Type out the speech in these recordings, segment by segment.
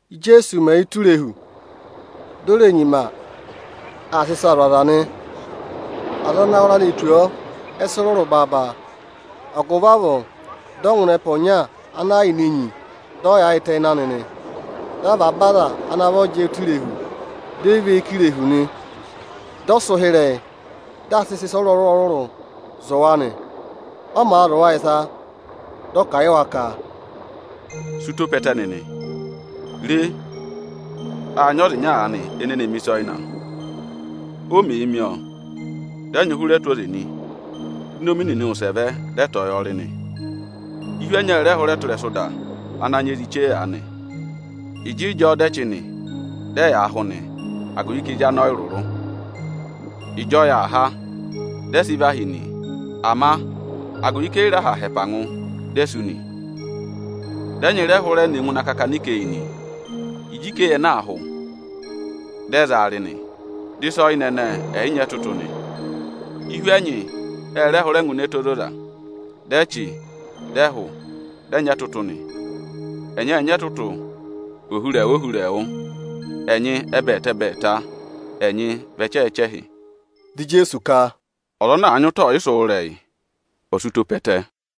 Íjeesu mẹ̀ yà ụtọ irehu, di o re nyima aa sị ịsaa zụ̀ aza nị. Aza ana wara ne tù ọọ, ẹ sị rụrụ baaba; agụvị avọọ dị ọ ngụ ịnị ẹpa ọnya ana yà ini enyi, dị ọ yaayịtẹ ịnị anị nị. Dị avaba aza ana vọ jẹẹ ụtọ irehu, dị ẹ và eyi kà irehu nị. Dị ọ sị ụhịrẹyị, dị aa sịị sị ịsa ọrụrụ-ọrụrụụ zụ̀ wa nị. Ọ màa zụ̀ wa ịsa, dị ọ kà a yị wa ka: “Sị ụtọ pe ẹtẹ nịnị! Re, â nyị ọza ịnya aanị ene ne mi ịsa ọyịna. O mèe mi ọọ, dị ẹnyị hụrẹ tụ́ ụtọ oze nị; di inomi nịnị wụsẹ vẹ, dị ẹ tọ̀ọ́ yọọ rị nị. Ihu ẹnyị ẹ rẹ hụrẹ tụ́ ịrẹsụ ịda ana nyị ezi chee aanị. Ịjịịjọọ dị ẹ chị nị, dị ẹyaa hụ nị, agụvị ka ezi anị ọyị rụrụ. Ịjị ọyị aa há, dị ẹ sị và hí nị, ama agụvị ka e yi re aha ha ẹpa ngụ, di e sú nị. Dị ẹnyị rẹ hụrẹ ne ngụ ịnị akakana ikeyi nị. Ịjị ikeyi ẹnẹẹ aa hụ, dị ẹ za wa rị nị, dị ịsa ọyịna ẹnẹẹ ẹ yị nyị ẹtụtụ nị. Ihu ẹnyị ẹ rẹ hụrẹ ne ngụ ịnị ẹtẹ ozoza, dị ẹ chị, dị ẹ hụ, dị ẹ nyị ẹtụtụ nị; ẹnyị ệ nyị ẹtụtụ ohurẹẹwụ-ohurẹẹwụ, ẹnyị ẹbẹẹta-ẹbẹẹta, ẹnyị vị ẹchẹhị-ẹchẹhị.” Dị Ijeesu ka, “Ọza ana àa nyị ụtọ ọyịsị wụ́ ịrẹyị, ọ̀ sị ụtọ pe ẹtẹ!”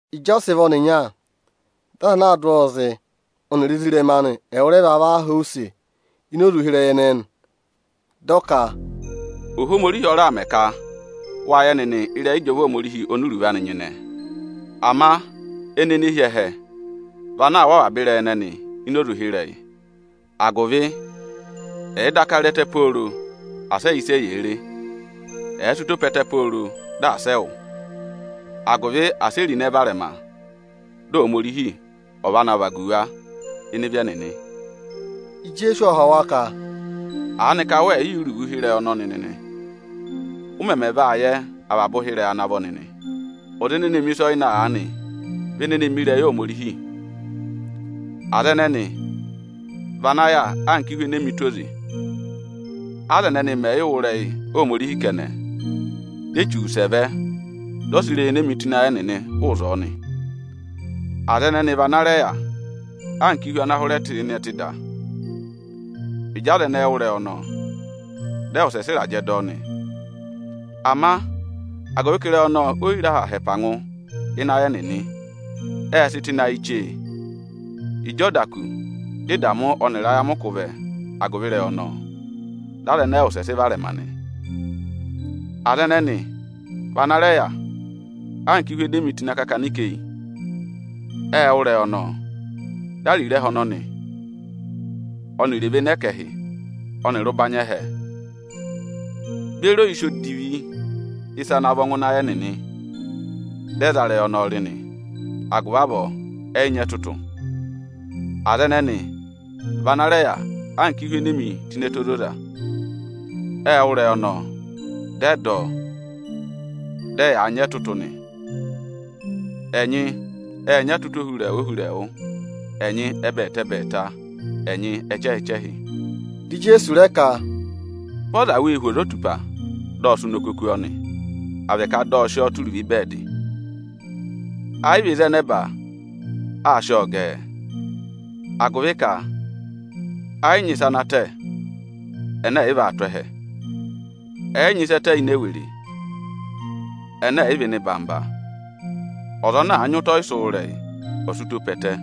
Ịjị ọ sị vị ọnịnya, dị aza anaā dụ ọọ zị ọnịrị ezirẹma anị ẹwụrẹva va họ̀ ọ use ini oze ụhịrẹyị ẹnẹẹ nị. Dị ọ ka, “Ohomorihi ọ raà mẹ ka wa yẹ nịnị ịrẹyị ịjọva Ohomorihi oni iruvo anị ana nyịnẹ. Ama ẹnị ene hi ẹhẹ vị ana aa wụ́ avaba ịrẹyị ẹnẹnị ini oze ụhịrẹyị; agụvị ẹ̀ẹ daka re ẹtẹ pooro, asị ẹ yẹ ịsị eyee re. Ẹ̀ẹ sị ụtọ pe ẹtẹ pooro, di asị ẹ yẹ ịsị ẹyaa wụ́, agụvị asị e ro ịnẹ varẹma, dị Ohomorihi ọ̀ va na vagu wa ịnị ịvị ẹnịnị.” Ijeesu ộ họ̀ wa ka, “Aanịka wẹ yị yẹ iruvo ụhịrẹyị ọnọnị nịnị? Ụ mẹmẹ vaa yẹ avaba ụhịrẹyị ana vọ nịnị? Ọza ene mi ịsa ọyịna aanị vị ene ne mi ịrẹyị Ohomorihi. Aza ẹnẹnị vị ana yà anka ihu enee mi tụ́ ụtọ oze; aza ẹnẹnị mẹ̀ yị wụ́ ịrẹyị Ohomorihi kẹnẹ, di Echu wụsẹ vẹ, dị ọ sị ịrẹyị enee mi tụ́ ịnị ayị ẹnịnị hụụ ịzọọ nị. Aza ẹnẹnị vị ana rẹ yà anka ihu ana hụrẹ tụ́ ịnị ẹtẹ ana sị mẹẹ ịda avọọ. Ịjị aza ẹnẹẹ wụ́ ịrẹyị ọnọọ, dị ẹ wụsẹ sị ịrajẹ dọ ọ nị. Ama agụvị ka ịrẹyị ọnọọ o yi re aha ha ẹpa ngụ ịnị ayị ẹnịnị, ệ sị tụ́ ịnị ayị chee; ịjị ọ da kù dị ẹngụkata ọnịrị ayamịkụ vẹ agụvị ịrẹyị ọnọọ, dị aza ẹnẹẹ wụsẹ sị varẹma nị. Aza ẹnẹnị vị ana rẹ yà anka ihu ene e mi tụ́ ịnị akakana ikeyi. Ệ wụ́ ịrẹyị ọnọọ, dị ariro ẹhẹ ọnọnị ọnịrị evene ẹkẹhị ọnịrị ụbanyị ẹhẹ beri oyisì odivi ịsa ana vọ ngụ ịnị ayị ẹnịnị, dị ẹ za ịrẹyị ọnọọ rị nị; agụvị avọọ ẹ yị nyị ẹtụtụ. Aza ẹnẹnị vị ana rẹ yà anka ihu ene e mi tụ́ ịnị ẹtẹ ozoza. Ệ wụ́ ịrẹyị ọnọọ, dị ẹ dọ ọ, dị ẹyaa nyị ẹtụtụ nị. Ẹnyị ệ nyị ẹtụtụ ohurẹẹwụ, ẹnyị ẹbẹẹta-ẹbẹẹta, ẹnyị ẹchẹhị-ẹchẹhị.” Dị Ijeesu rẹ ka, “Vị ọza wéé hu ozotupa, dị ọ sị ụnọkọ kú ọọ nị, à vị ka dị ọ̀ sị ọọ tụ́ uruvo ịbẹẹdị nị? Ẹ yị vị ịzị ẹ nẹba aā sị ọọ gẹẹ? Agụvị ka ẹ yị nyị ịsa ana tẹ ẹnẹ ẹ̀ yị vaa tụ́ ẹhẹ; ẹ yị nyị ịsa ẹ tẹ ini ewere, ẹnẹ ẹ̀ yị vaa tụ́ ẹhẹ chapaa. Ọza ana àa nyị ụtọ ọyịsị wụ́ ịrẹyị, ọ̀ sị ụtọ pe ẹtẹ!”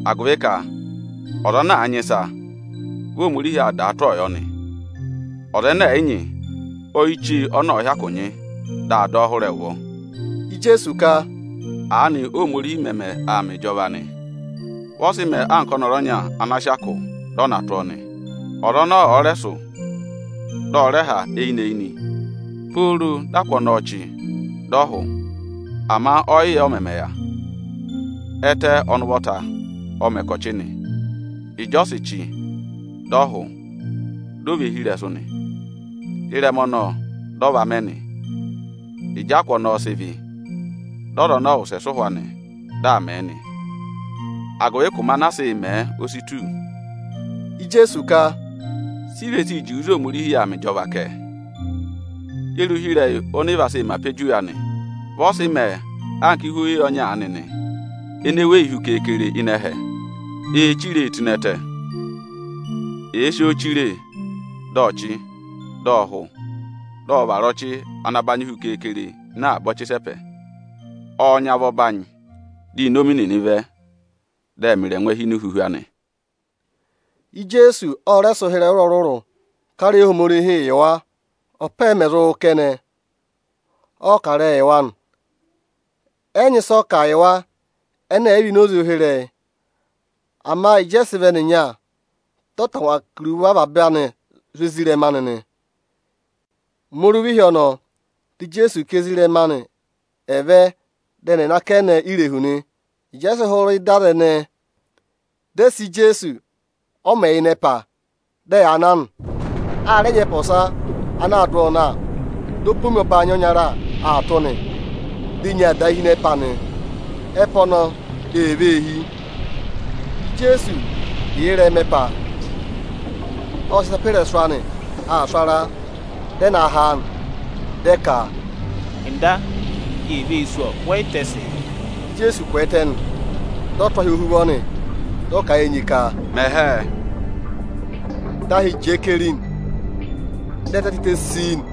Agụvị ka ọza ana àa nyị ịsa, vị Ohomorihi vaa dàa tụ́ ọọ yọ nị. Ọza ẹnẹ ẹ̀ yị nyị, oyichee ọnọ ọ̀ọ hyakụ nyị, dị a dọ ọ hụrẹ ẹ ụvọ.” Ijeesu ka, “Aanị Óhomorihi mẹmẹ aa mẹ ịjọva nị. Vị ọ sị mẹẹ anka ọnọrụ ọnya ana sị akụ, dị ọ na tụ́ ọọ nị. Ọza ọnọọ ọ̀ọ rẹ sụ̀, dị ọ rẹ ha eyinị-eyinị, pooro dị akụ ọnọọ chị dị ọ hụ; ama ọ yị yẹ ọ mẹmẹ mẹ. Ẹtẹ, ọnị ụvọta, ọ mẹ ka ọ̀ chị nị. Ịjị ọ sị chị, dị ọ hụ, di o ve hi ịrẹsụ nị. Ịrẹma ọnọọ, dị ọ va mẹ nị. Ịjị akụ ọnọọ ọ̀ọ sị vị́, dị ọza ọnọọ wụsẹ sị ụhwọ anị, dị aa mẹ̀ ẹ nị, agụvị ka ụmẹ anaa sịị̄ mẹ̀ ẹ, o si tù.” Ijeesu ka, “Si i ve sii juwe ịzị Ohomorihi yà aa mẹ ịjọva kẹ? Ye re ụhịrẹyị oni i ve sii mẹ apojuwe anị? Vị ọ sị mẹẹ anka ihu oweyi ọnya aanị nị, ene weyi hu keekere ịnị ẹhẹ nị. Eē chire e tụ́ ịnị ẹtẹ. Èe si oo chire, dị ọ chị, dị ọ hụ, dị ọ vara ọchị ana banyị hu keekere ịnị avaba ọchị ịsẹpẹ. Ọọ̄ nyị avọ ọbanyị, di inomi nịnị vẹ, dị ẹ mẹ ịrẹngwẹ hi ini ihuhu anị.” Ijeesu ộ rẹ sị ụhịrẹyị ọrụrụ-ọrụrụ kà ịrẹyị Ohomorihi yị wa. Ọpa ẹ mẹ̀ zụ wụ́ kẹnẹ, ọ kà ịrẹyị yị wa nị. Ẹ yị nyị ịsị ọ kà yị wa, ẹnẹ ẹ̀ yị vị ini oze ụhịrẹyị. Ama ịjị ọ sị vị ọnịrị ezirẹma anị anava, dị ọ tangwa kà iruvo avaba anị zụ̀ ezirẹma anị nị. Ụmẹ oruva ịhị ọnọọ, di Ijeesu ka ezirẹma anị ẹ̀ vẹ dị ẹnị ẹ̀ nọ akẹnẹ irehu nị. Ịjị ẹ sị hụrị ịdị aza ẹnẹẹ, dị ẹ sị Ijeesu ọ mẹ̀ yị yà ngụ ịnị ẹpa, dị ẹyaa na nị. A rẹ nyị ẹpa ọsa ana aa dụ ọọ na. Di opomi ọbanyị ọnyara aa tụ́ nị, di enyi aa dàa hi ịnị ẹpa nị. Ẹpa ọnọọ ee vee hí. Ijeesu yà ịnị ẹpa ọnọ, ộ sị ịsa pe ịrẹsụ aa sụ̀ ara. Dị ẹ na ha a nị, dị ẹ ka, “Nda, eni ee vee sú ọ! Wẹ yị tẹsịị?” Di Ijeesu kwẹẹtẹ nị, dị ọ tụ́ ahị ọnọọ Ohuvọ nị. Dị ọ kà a yị enyi ka: ọ mẹ hẹẹ! Dị ahị jẹẹ keri, dị ẹtẹ tịtẹ sii nị.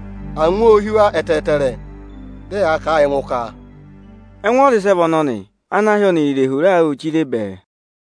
Angwa ô hí wa ẹtẹẹtẹrẹ, dị ẹyaa kà a yị ẹngụ ka: Ẹngụ ọza ịsị ẹ vị ọnọnị ana ahị ọnịrị irehu raa wụ́ụ chire bẹẹ aanị?